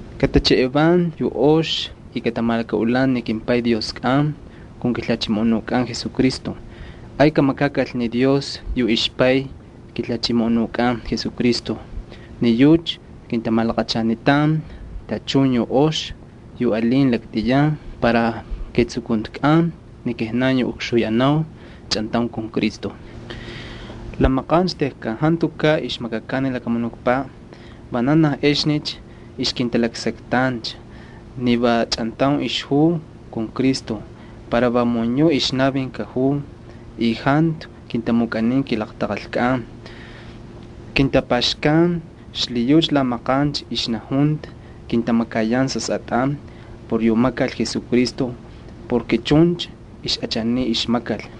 Katamapaynin yu ox y katamalakaꞌulan ni kimPay Dioskꞌan kun kiJalhachimoꞌonukꞌan Jesucristo. Ay kamakakal ni Dios yu ixPay kiJalhachimoꞌonukꞌan Jesucristo. Ni yucha kintamalaqachanitan tachun yu ox yu alin laktꞌiyan para ketsukuntikꞌan ni kijnan yu ukxuyanau chꞌantaun kun Cristo. La maqancha tejkan jantukaꞌ ixmakakan ni lakamunukpaꞌ, vananaj exnicha ixkintalaksaktancha ni va chꞌantaun ixjuu kun Cristo para vamun yuꞌ ixnavin kajuu y jantu kintamukꞌanin kilaqtaqalkꞌan. Kintapaxkan y xlhiyucha la maqancha ixnajunta kintamakayan sasꞌatꞌan por yu makal Jesucristo porke chuncha ixꞌachaniy ixmakal.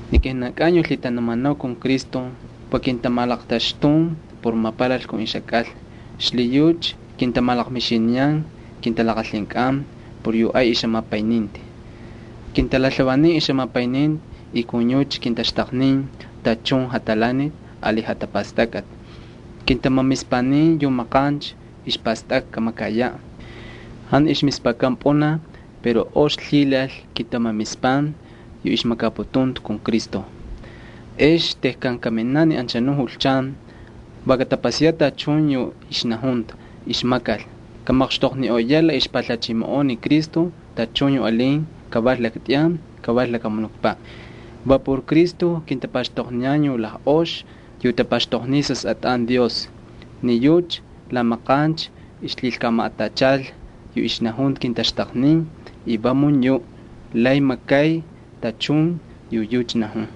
Ni kijnankꞌan yu lhitanumanau kun Cristo va kintamalaqtaxtun por mapalal kun ixjakꞌalna. Xlhiyucha kintamalaqmixiniyan kintalaqalhinkꞌan por yu ay ixjamapayninti. Kintalalhavanin ixjamapayninti y kintaxtaqnin tachun jatalaniti ali jatapastakꞌati. Kintamamispanin yu maqancha ixpastakꞌa kamakayaꞌ. Jantu ixmispakan pꞌunaj pero ox lhilal kintamamispan yu ixmakaputunta kun Cristo. Ex tejkan kaminaꞌ ni anchanuꞌ julchan va katapasayaꞌ tachun yu ixnajunta ixmakal. Kamaqxtoqniꞌoyaꞌ la ixpalhachimoꞌon ni Cristo tachun yu alin, kaval laktꞌiyan kaval lakamunukpaꞌ. Va por Cristo kintapaxtoqniyan yu lajꞌoxi yu tapaxtoqniy sasꞌatꞌan Dios. Ni yucha la maqancha ixlhilkamaꞌatachal ni kijnan yu kintalaksaknitan. Va chuncha ixnajunta kamakal y vamun yuꞌ lay makay tachun yu yucha najun.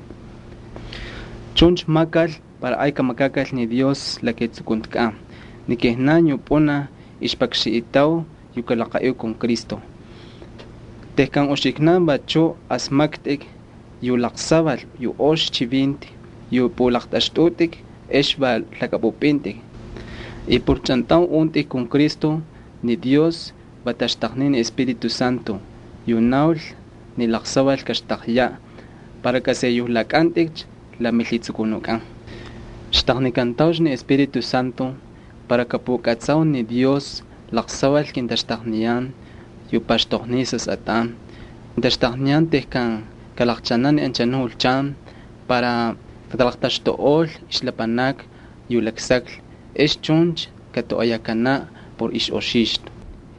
Chuncha makal para ay kamakakal ni Dios la ketsukuntikꞌan ni kijnan yu pꞌunaj ixpakxanꞌitau yu kalaqaꞌiu kun Cristo. Tejkan uxiknan vachu asmaktꞌik yu laqsaval yu ox chivinti yu pꞌulaqtꞌaxtꞌutꞌik ex va lhakꞌapꞌupꞌintꞌik. Ex por chꞌantaun untꞌik kun Cristo, ni Dios va taxtaqnin ni Espíritu Santo yu naul ni laqsaval kaxtaqyaꞌ para kaseyolakꞌantꞌikcha la milhitsukunukꞌan. Xtaqnikantaucha ni Espíritu Santo para kapukꞌatsau ni Dios laqsaval kintaxtaqniyan yu paxtoqniy sasꞌatꞌan. Kintaxtaqniyan tejkan kalaqchaanacha ni anchanuꞌ julchan para katalaqtaxtuꞌol ixlapanakni yu laksaklhi. Ex chuncha katoꞌoyakanaꞌ por ixꞌoxixtu.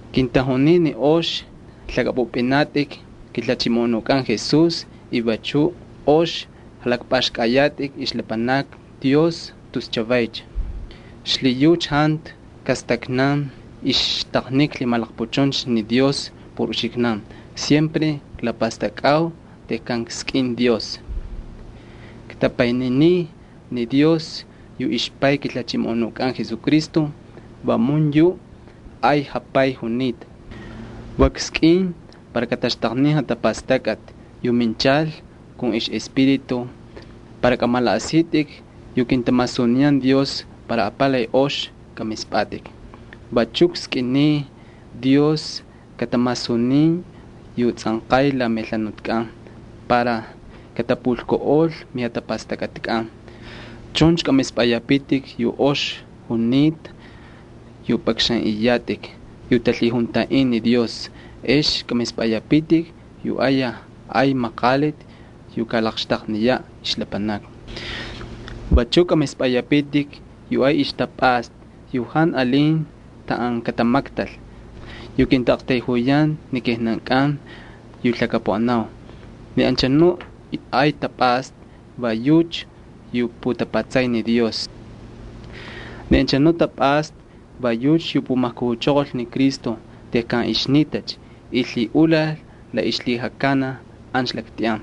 Kintajunin ni ox lhakꞌapꞌupꞌinatꞌik kiJalhachimoꞌonukꞌan Jesús y vachu ox jalakpꞌaxkꞌayatꞌik ixlapanakni Dios tus chavaycha. Xlhiyucha jantu ijkastaknan ixtaqnika lhimalaqpuchuncha ni Dios por uxiknan, va si klapastakꞌau tejkan kskꞌin Dios. Ktapayninin ni Dios yu ixPay kiJalhachimoꞌonukꞌan Jesucristo, vamun yu ay jaPay junita. Va kskꞌin para kataxtaqnin jatapastakꞌati yu minchal kun ixꞌEspíritu para kꞌamalaꞌasitꞌik yu kintamasuniyan Dios para apalay ox kamispꞌatꞌik. Vachu kskꞌiniy Dios katamasunin yu tsꞌanqay la melhanutkꞌan para katapulkuꞌol mijatapastakꞌatikꞌan. Chuncha kꞌamispꞌayapitik yu ox junita yu pꞌakxanꞌiyatꞌik yu talhijuntaꞌin ni Dios. Ex kꞌamispꞌayapitik yu ayaj ay maqaliti yu kalaqxtaqniyaꞌ ixlapanakni. Vachuꞌ kꞌamispꞌayapitik yu ay ixtapꞌasta, yu jantu alin taꞌan katamaktal, yu kintaꞌaqtayjuyan ni kijnankꞌan yu lhakapuꞌanau. Ni anchanu ay tapꞌasta va yucha yu putapatsay ni Dios. Ni anchanu tapꞌasta va yucha yu pumajkujuchoqol ni Cristo tejkan ixnitacha y lhiꞌulal la ixlhijakanaj ancha laktꞌiyan.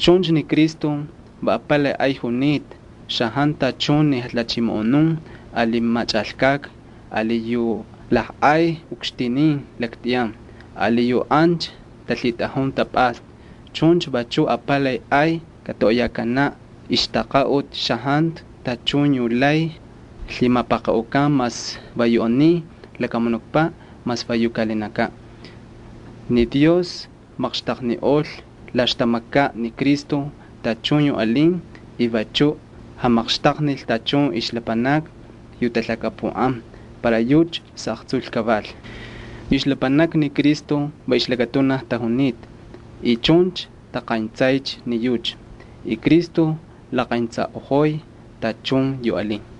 Chuncha ni Cristo va apalay ay junita xajantu tachun ni jalhachimoꞌonun ali machꞌalkꞌakni ali yu lajꞌay ukxtinin laktꞌiyan ali yu ancha talhitꞌajun tapꞌasta. Chuncha vachuꞌ apalay ay katoꞌoyakanaꞌ ixtaqaꞌuti xajantu tachun yu lay lhimapaqaꞌukan, mas va yu aniy lakamunukpaꞌ mas va yu kaꞌalinakaꞌ. Ni Dios maqxtaqniꞌol la ixtamakaꞌ ni Cristo tachun yu alin y vachuꞌ jamaqxtaqnil tachun ixlapanakni yu talhakapuꞌan para yucha xaꞌaqtsul kaval. Yu ixlapanakni ni Cristo va ixlakatunaj tajunita y chuncha taqayntsaycha ni yucha y Cristo laqentsaꞌojoy tachun yu alin.